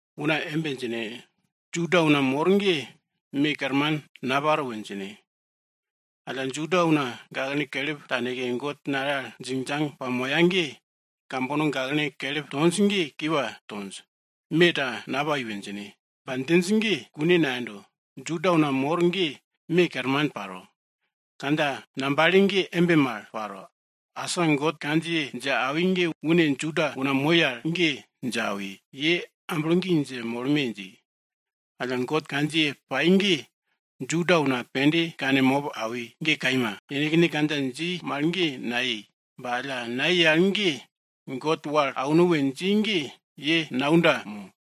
Una embe djine, Juda una mor ge me kerman naparo we djine. Alla Juda una gaklene kelip taneke God nale al djingdjang pamoya ge kambono gaklene kelip tonj ge kiwa tonj, me ta napai we djine. Ba djinj ge kune nayendo. Juda una mor ge me kerman paro. Kandja ngambale ge embe mal paro. Asa God kandjiye dje awi ge une Juda una moi al ge dje awi, ye amblo gi dje molme! dji. Alla God kandjiye pai ge Juda una pende kane mop awi, ge kaima. Yenekne kandja dji mal ge nayei, ba alla nayei al ge, God wal auno we dji ge ye naunda mo?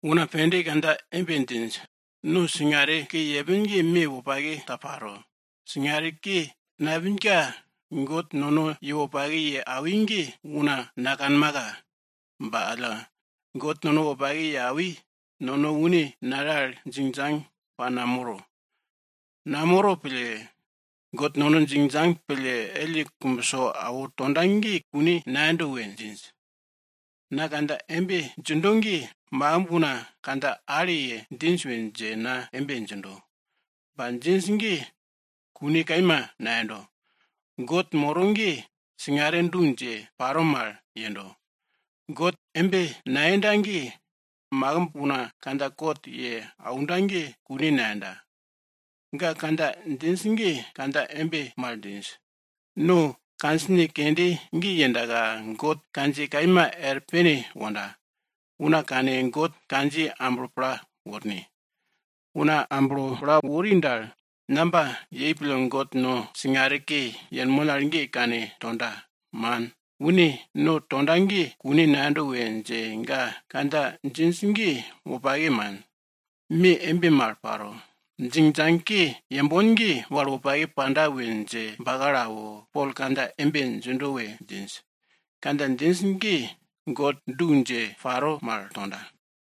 Una pende kandja embe djinj, nono singare ke yepin ge me wopake ta paro. Singare ke nayepinka God nono ye wopake ye awi ge, una nakanmaka. Ba alla God nono wopake ye awi, nono une nale al djingdjang pa namoro. Namoro pille, God nono djingdjang pille elle kumbso awo tonda ge kune nayendo we djinj. Na kandja embe djindo ge makimb una kandja ale ye djinj we dje na embe djindo. Ba djinj ge kune kaima nayendo. God moro ge singare du dje paro mal yendo. God embe nayenda ge, une makimb una kandja kot ye aunda ge kune nayenda. Ga kandja djinj ge kandja embe mal djinj, no kandjine kende ge yendaka God kandjiye kaima er pene wonda, una kane God kandjiye amblo pla worne. Una amblo pla wori dal, namba yei pille God no singare ke yenmon al ge kane tonda? Man, une no tonda ge kune nayendo we dje ga kandja embe djinj. Kandja djinj ge wopake, man. Me embe mal paro. Singare ke yembon ge, wal wopake panda we dje bakalo awo, Pol kandja embe djindo we djinj. Kandja djinj ge God du dje paro mal tonda.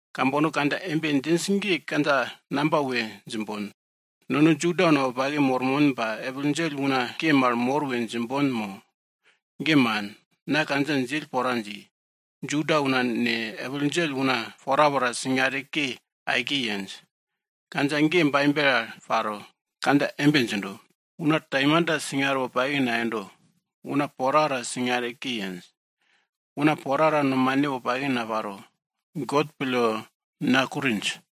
Kambono kandja embe djinj ge kandja namba we djimbon? Nono Juda una wopake mormon ba epil djell una ke mal mor we djimbon mo? Ge man. Na kandja djill pora dji. Juda una ne, epil djell una porapora singare ke aike yenj. Kandja ge Baibel al paro. Kandja embe djindo, Una taimanta singare wopake nayendo, una porapora singare ke yenj. Una porapora nomane wopake naparo, God pille nakurinj.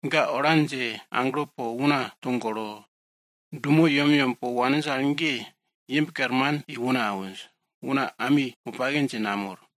Ga ola dje aglo po una togolo, dumo yemyem po waninj al ge, imb kerman i una awinj, una ami wopake dje namor.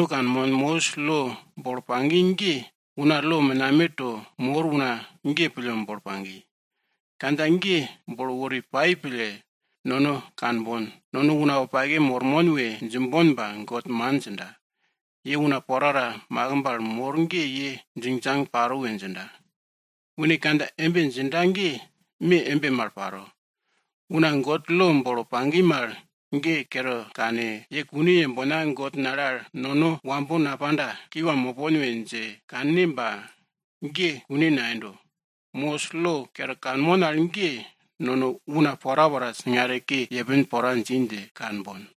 Nono kanmon, Mosis lo bolo pagi ge una lo menameto mor una ge pille bolo pagi. Kandja ge bolo wori pai pille nono kanbon, nono una wopake mormon we djimbon ba God man djinda. Ye una porapora makimb al mor ge ye djingdjang paro we djinda. Une kandja embe djinda ge me embe mal paro. Una God lo bolo pagi mal ge kere kane, ye kune yembona God nale al nono wambo napanda, kiwa mopon we dje kanne ba ge kune nayendo. Mosis lo kere kanmon al ge, nono una porapora singare ke yepin pora dji dje kanbon.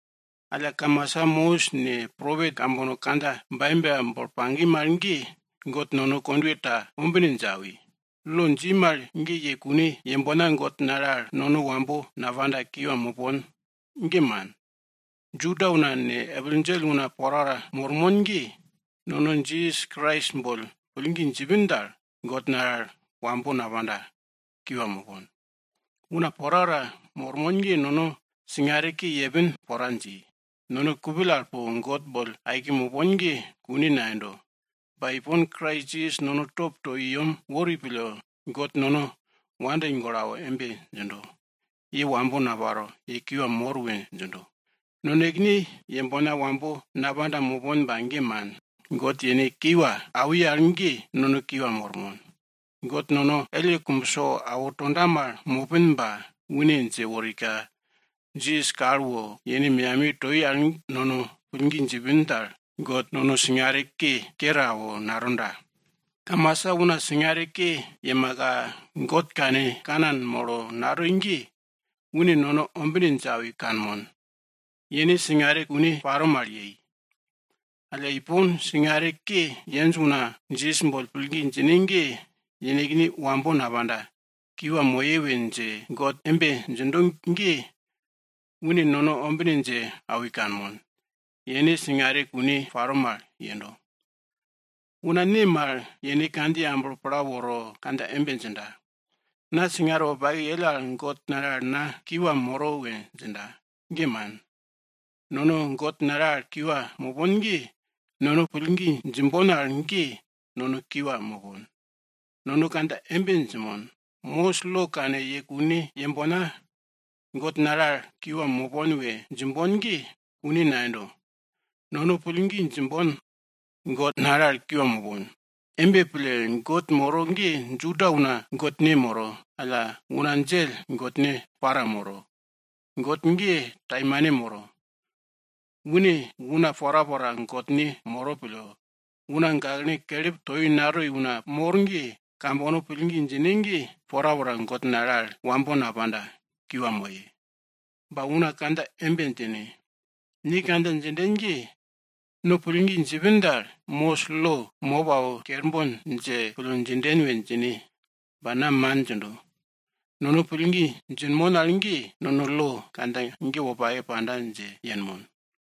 Alla kamasa Mosis ne, propet kambono kandja Baibel al bolo pagi mal ge, God nono kondwe ta ombine dje awi. Lo dji mal ge ye kune yembona God nale al nono wambo napanda, kiwa mopon, ge man. Juda una ne, epil djell una porapora mormon ge, nono Jisas Krais boll pillgi djipin dal, God nale al wambo napanda kiwa mopon. Una porapora mormon ge nono singare ke yepin pora dji. Nono kupill al po God boll aike mopon ge kune nayendo. Ba ipon Krais Jisas nono top to i yem wori pille, God nono wopake pille awo embe djindo, ye wambo naparo, ye kiwa mor we djindo. Nonekene yembona wambo napanda mopon ba ge man, God yene wopake ye wal gorwulle kiwa awi al ge nono kiwa mormon. God nono elle kumbso awo tonda mal mopin, ba une dje worika, Jisas kal wo yene meyamiye toi al nono pillgi djipin dal, God nono singare ke yepin ge kere awo, natonda. Kamasa una singare ke yemaka, God kane kanan molo natoi ge, une nono ombine dje awi kanmon, yene singare kune paro mal yei. Alla ipon, singare ke yenj una Jisas boll pillgi djine ge yenekne wambo napanda, kiwa moye we dje God embe djindo ge, une nono ombine dje awi kanmon, yene singare kune paro mal yendo. Una ne mal yene kandjiye amblo pla woro kandja embe djinda, na singare wopake yell al God nale al na kiwa moro we djinda? Ge man. Nono God nale al kiwa mopon ge nono pillgi djimbon al ge nono kiwa mopon. Nono kandja embe djinmon. Mosis lo kane ye kune yembona God nale al kiwa mopon we djimbon ge kune nayendo. Nono pillgi djimbon, God nale al kiwa mopon. Embe pille, God moro ge Juda una Godne moro, alla una djell Godne para moro eri. God ge taimane moro. Une una porapora Godne moro pille, una gaklene kelip toi mo, natoi una mor ge kambono pillgi djine ge porapora God nale al wambo napanda, kiwa moye. Ba una kandja embe djine, ni kandja djinden ge, no pillgi djipin dal, Mosis lo mop awo kerbon dje pille djinden we djine. Ba na man djindo. Nono pillgi djinmon al ge, nono lo kandja ge wopake panda dje yenmon.